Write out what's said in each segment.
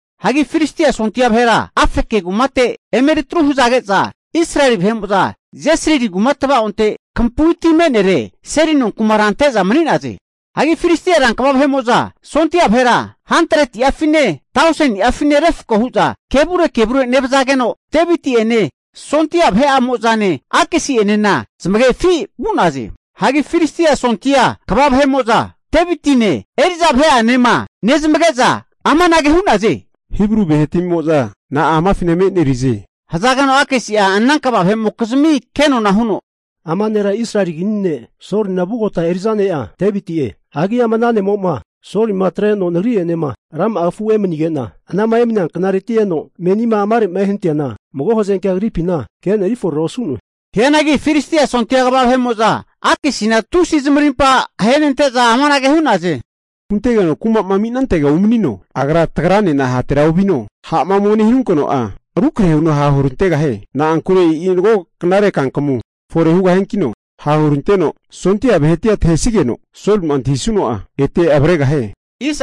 Hagi Filistia sondia vahera Afeke kumate emeri atru hazage'za, Israeli vahe'mo'za Jesrili kuma tva'onte kampui ti me'nere seli nonkumara ante'za mani'naze. Hagi Filistia rankva vahe'mo'za sondia vahera 100'afine, tauseni'afine refko hu'za kevure kevure nevazageno Deviti'ene sondia vahe'amo'zanena Akisi'enena zamagefi vu'naze. Hagi Filistia sondia kva vahe'mo'za Devitine eri'za vahe'anema nezamage'za amanage hu'naze, Hibru vahetamimo'za na'a amafina emenerize? Hazageno Akisi'a ana kva vahe'mokizmi kenona huno, Ama nera Israeli kini ne' Solina vugota eri'za ne'a Deviti'e. Hagi ama ana ne'mo'ma Solima atreno nagri'enema rama'a kafu emanige'na, anama emania knareti'ma eno menima amare'ma ehanatineana, mago hazankea agripina kena eriforera osu'noe. Hianagi Filistia sondia kva vahe'mo'za Akisina tusi zamarimpa ahenente'za amanage hu'naze, huntegeno kuma'ma ami'nantega umanino. Hagi atregeno agra tagranena hatera ovino, ha'ma ome nehanunkeno'a rukrahe huno hahurantegahie. Na'ankure e'i mago knare kankamu fore hugahiankino, ha' huranteno sondia vahetia tahesigeno, Solima antahisuno'a ete avregahie.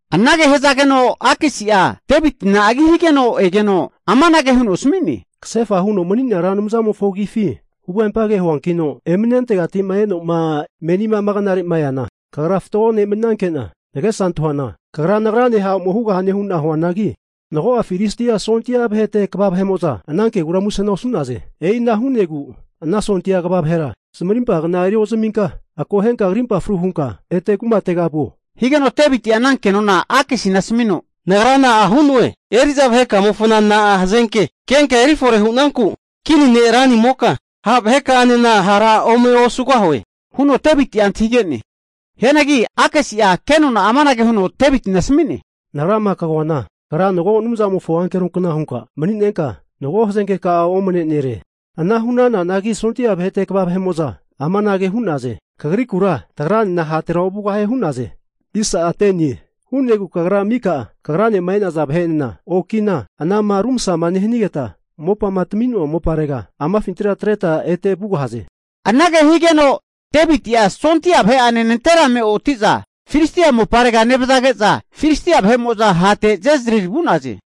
Anage hazageno Akisi'a Devitina agi higeno egeno, amanage huno asmi'ne, Kasefa huno mani'nea Ra Anumzamofo agifi huvempage huankino, emani'nantegati'ma e'noma menina ama knare'ma eana, kagra fatgo ne' mani'nanke'na nagesa antahuana kagra nagrane ha' ome hugahane hu'na huanangi, mago'a Filistia sondia vahete kva vahe'mo'za ana kegura musena osu'naze. E'ina hu'negu ana sondia kva vahera zamarimpa kna eri ozaminka, akohenka krimpa fru hunka ete kumatega vuo. Higeno Devitia ana kenona Akisina asamino, nagra na'a hu'noe? Eri'za vahekamonafina na'a hazenke kenka eri fore hu'nanku kini ne' ranimoka, ha' vahekanena hara ome osugahue huno Devitina antahige'ne. Hianagi Akisi'a ke nona'a amanage huno Devitina asmi'ne, Nagra'ma kagoana, kagra mago Anumzamofo ankeronkna hunka mani'nenka, mago hazenke ka'a omane nere. Ana hu'nananagi sondia vahete kva vahe'mo'za amanage hu'naze, Kagrikura tagranena hatera ovugahie hu'naze. Hu'negu kagra mika kagranema e'naza vahe'enena okina anama rumasama nehanigeta, mopama tami'noa moparega amafintira atreta ete vugahaze. Anage higeno Deviti'a sondia vahe'ane nanterame oti'za Filistia moparega nevazage'za, Filistia vahe'mo'za hate Jezrili vu'naze.